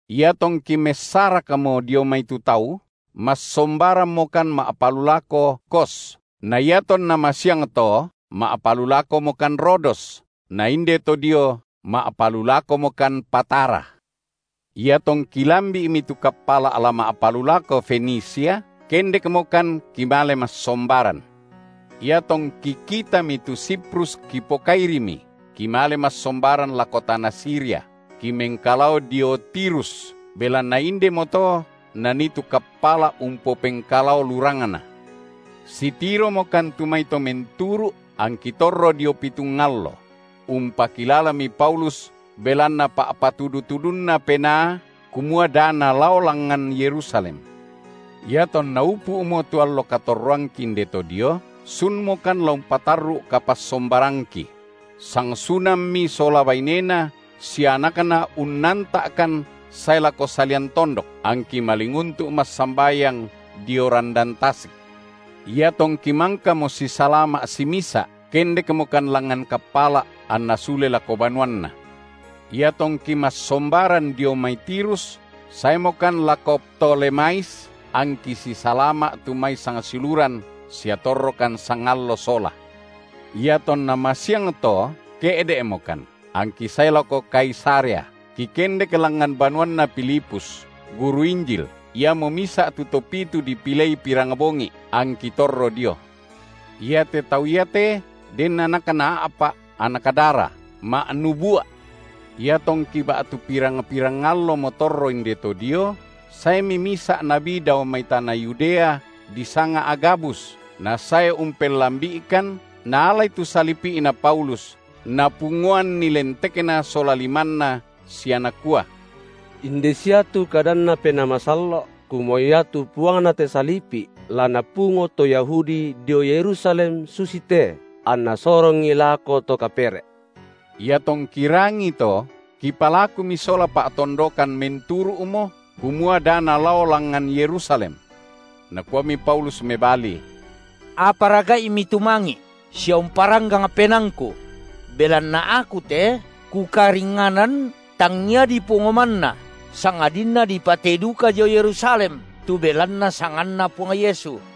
Iatongki messarakmo dio mai tu tau, massombarammokan ma’palulako Kos, na iatonna masiangto ma’palulakomokan Rodos, na inde to dio ma’palulakomokan Patara. Iatongki lambi’mi tu kappala’ la ma’palulako Fenisia, kendekmokan kimale massombaran. Iatongki kitami tu Siprus kipokairimi, kimale massombaran lako tana Siria, kimengkalao dio Tirus, belanna indemoto nanii tu kappala’ umpopengkalao lurangna. Sitiromokan tu mai to menturu’ angki torro dio pitung allo; umpakilalami Paulus belanna pa’patudu-tudunNa Penaa kumua da nalao langngan Yerusalem. Iatonna upu’mo tu allo katorroangki inde to dio, sunmokan la umpatarru’ kapassombarangki; sangsunammi sola bainena sia anakna unnanta’kan sae lako salian tondok, angki malinguntu’ massambayang dio randan tasik. Iatongki mangkamo sisalama’ simisa’, kendekmokan langngan kappala’, anna sule lako banuanna. Iatongki massombaran dio mai Tirus, saemokan lako Ptolemais angki sisalama’ tu mai sangsiuluran, sia torrokan sangallo sola. Iatonna masiangto ke’de’mokan, angki sae lako Kaisarea, kikendek langngan banuanna Filipus, guru Injil, iamo misa’ tu to pitu dipilei pirangbongi’, angki torro dio. Iate tau iate den anakna a’pa’ anak dara, ma’nubua’. Iatongki ba’tu pirang-pirang allomo torro inde to dio, saemi misa’ nabi dao mai tana Yudea, disanga Agabus, nasae umpellambi’ikan, naalai tu salipi’na Paulus, napungoanni lentekna sola limanna sia nakua: Inde sia tu kadanNa Penaa Masallo’, kumua iatu Puangna te salipi’ la napungo to Yahudi dio Yerusalem susite, anna sorongi lako to kapere’. Iatongki rangii to, kipalakumi sola pa’tondokan menturu’mo, kumua da nalao langngan Yerusalem. Nakuami Paulus mebali: Apara ga’imi tumangi’ sia umparanggang penaangku? belanna aku te kukaringnganan tangia dipungo manna sangadinna dipatei duka dio Yerusalem tu belanna sanganNa Puang Yesu.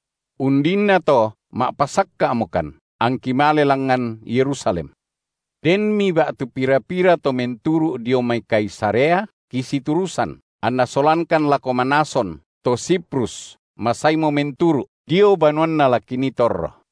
Undinnato ma’pasakka’mokan, angki male langngan Yerusalem. Denmi ba’tu pira-pira to menturu’ dio mai Kaisarea kisiturusan, anna solangkan lako Manason, to Siprus masaimo menturu’, dio banuanna la kinii torro.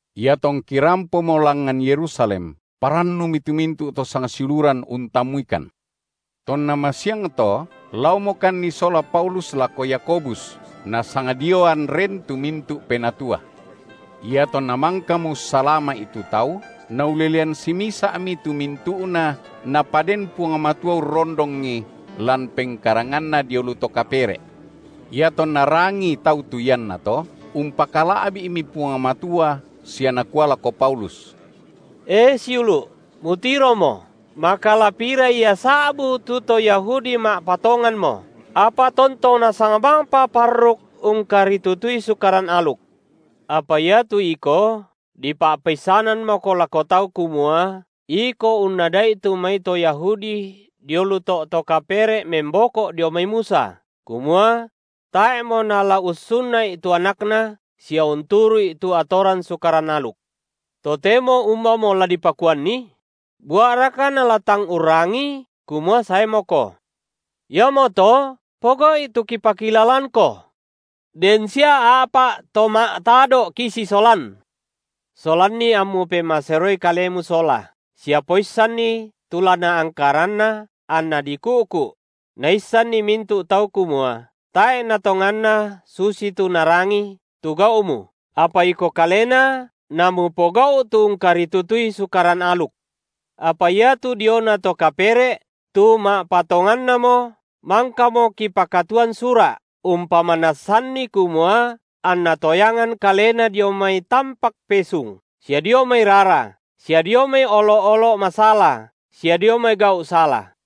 Iatongki rampomo langngan Yerusalem, parannumi tu mintu’ to sangsiuluran untammuikan. Tonna masiangto, laomokanni sola Paulus lako Yakobus, nasangdioan ren tu mintu’ penatua. Iatonna mangkamo ussalama’i tu tau, naulelean simisa’mi tu mintu’na Napaden Puang Matua urrondongi lan pengkaranganna dio lu to kapere’. Iatonna rangii tau tu iannato, umpakala’bi’mi Puang Matua sia nakua lako Paulus: E siulu’, mutiromo, maka la pira ia sa’bu tu to Yahudi ma’patonganmo, apa tontong nasang bangpa parruk ungkaritutui Sukaran aluk. Apa iatu iko, dipa’peissanammoko lako tau kumua iko unnada’i tu mai to Yahudi dio lu to’ to kapere’ memboko’ dio mai Musa, kumua: Tae’ mo nala ussunna’i tu anakna sia unturu’i tu atoran sukaran aluk; totemo umbamo la dipakuanni? bua’raka nala tang urrangii kumua saemoko. Iamoto pogau’i tu kipakilalangko. Den sia a’pa’ to ma’tado’ kisisolan; solanni ammu pemaseroi kalemu sola, sia poissanni tu la naangkaranna anna diku’ku’; naissanni mintu’ tau kumua tae’ natonganna susitu narangi tu gau’mu, apa iko kalena, na mupogau’ tu ungkaritutui Sukaran aluk. Apa iatu diona to kapere’ tu ma’patongannamo, mangkamo kipakatuan sura’ umpamanassanni kumua anna toyangan kalena dio mai tampak pesung, sia dio mai rara, sia dio mai olo’-olo’ masala sia dio mai gau’ sala.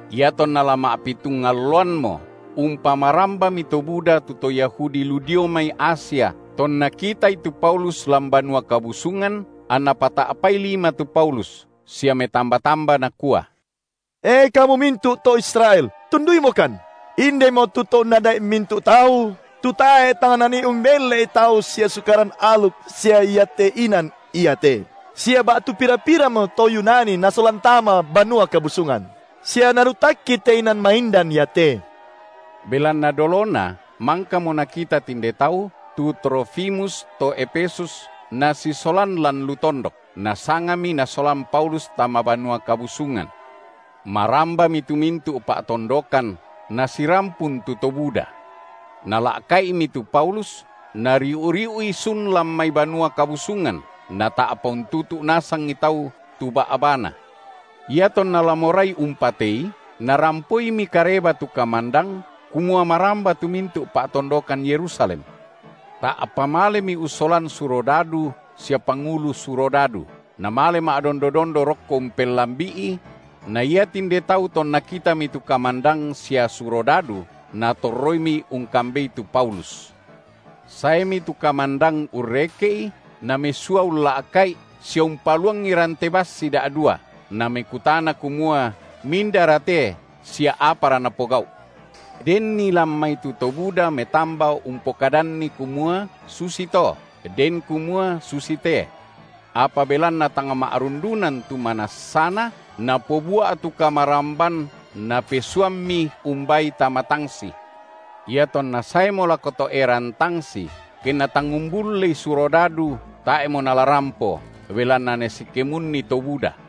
Iatonna la ma’pitung alloammo, umpamarambami to buda tu to Yahudi lu dio mai Asia tonna kitai tu Paulus lan Banua Kabusungan, anna pata’pai lima tu Paulus, sia metamba-tamba, nakua: E kamu mintu’ to Israel, tunduimokan! Indemo tu to unnada’i mintu’ tau, tu tae’ tang nanii umbelle’i tau sia Sukaran aluk sia iate inan iate. Sia ba’tu pira-piramo to Yunani nasolan tama Banua Kabusungan, sia naruttakki te inan maindan iate. Belanna dolona mangkamo nakita tinde tau tu Trofimus to Efesus nasisolan lan lu tondok, nasangami nasolan Paulus tama Banua Kabusungan. Marambami tu mintu’ pa’tondokan, nasirampun tu to buda. Nala’ka’imi tu Paulus, nariu’-riu’i sun lan mai Banua Kabusungan, nata’pa untutu’ nasangi tau tu ba’bana. Iatonna la morai umpatei, narampoimi kareba tu kamandang kumua maramba tu mintu’ pa’tondokan Yerusalem. Ta’pa malemi ussolan surodadu sia pangulu surodadu, namale ma’dondo-dondo rokko umpelambi’i; na ia tinde tau tonna kitami tu kamandang sia surodadu, natorroimi ungkambei tu Paulus. Saemi tu kamandang urreke’i, namesua ulla’ka’i sia umpaluangi rante bassi da’dua, namekutana kumua mindara te sia apara napogau’. Denni lan mai tu to buda metamba umpokadanni kumua susi to, den kumua susi te. Apa belanna tang ma’rundunan tu manassana, napobua’ tu kamaramban, napesuammi umbaai tama tangsi. Iatonna saemo lako to’eran tangsi, kenna tang umbullei surodadu, tae’mo nala rampo, belanna nasikemunni to buda.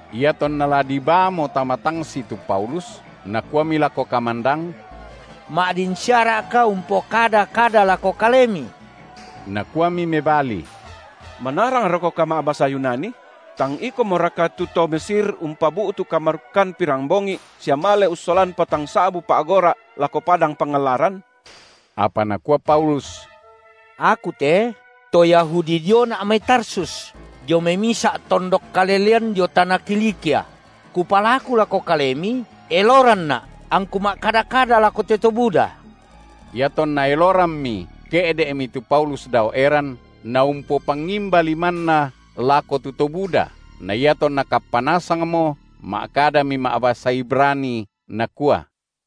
Iatonna la dibaamo tama tangsi tu Paulus, nakuami lako kamandang: Ma’din siara’ka umpokada kada lako kalemi? Nakuami mebali: Manarangrokoka ma’basa Yunani? Tang ikomoraka tu to Mesir umpabu’tu kamarukkan pirambongi’ sia male ussolan patang sa’bu pa’gora’ lako padang pangallaran? Apa nakua Paulus: Aku te to Yahudi diona’ mai Tarsus, dio mai misa’ tondok kalelean dio tana Kilikia; kupalaku lako kalemi, eloranna’ angku ma’kada-kada lako te to buda. Iatonna elorammi, ke’de’mi tu Paulus dao eran, naumpopangimba limanna lako tu to buda, na iatonna kappa nasangmo, ma’kadami ma’basa Ibrani, nakua: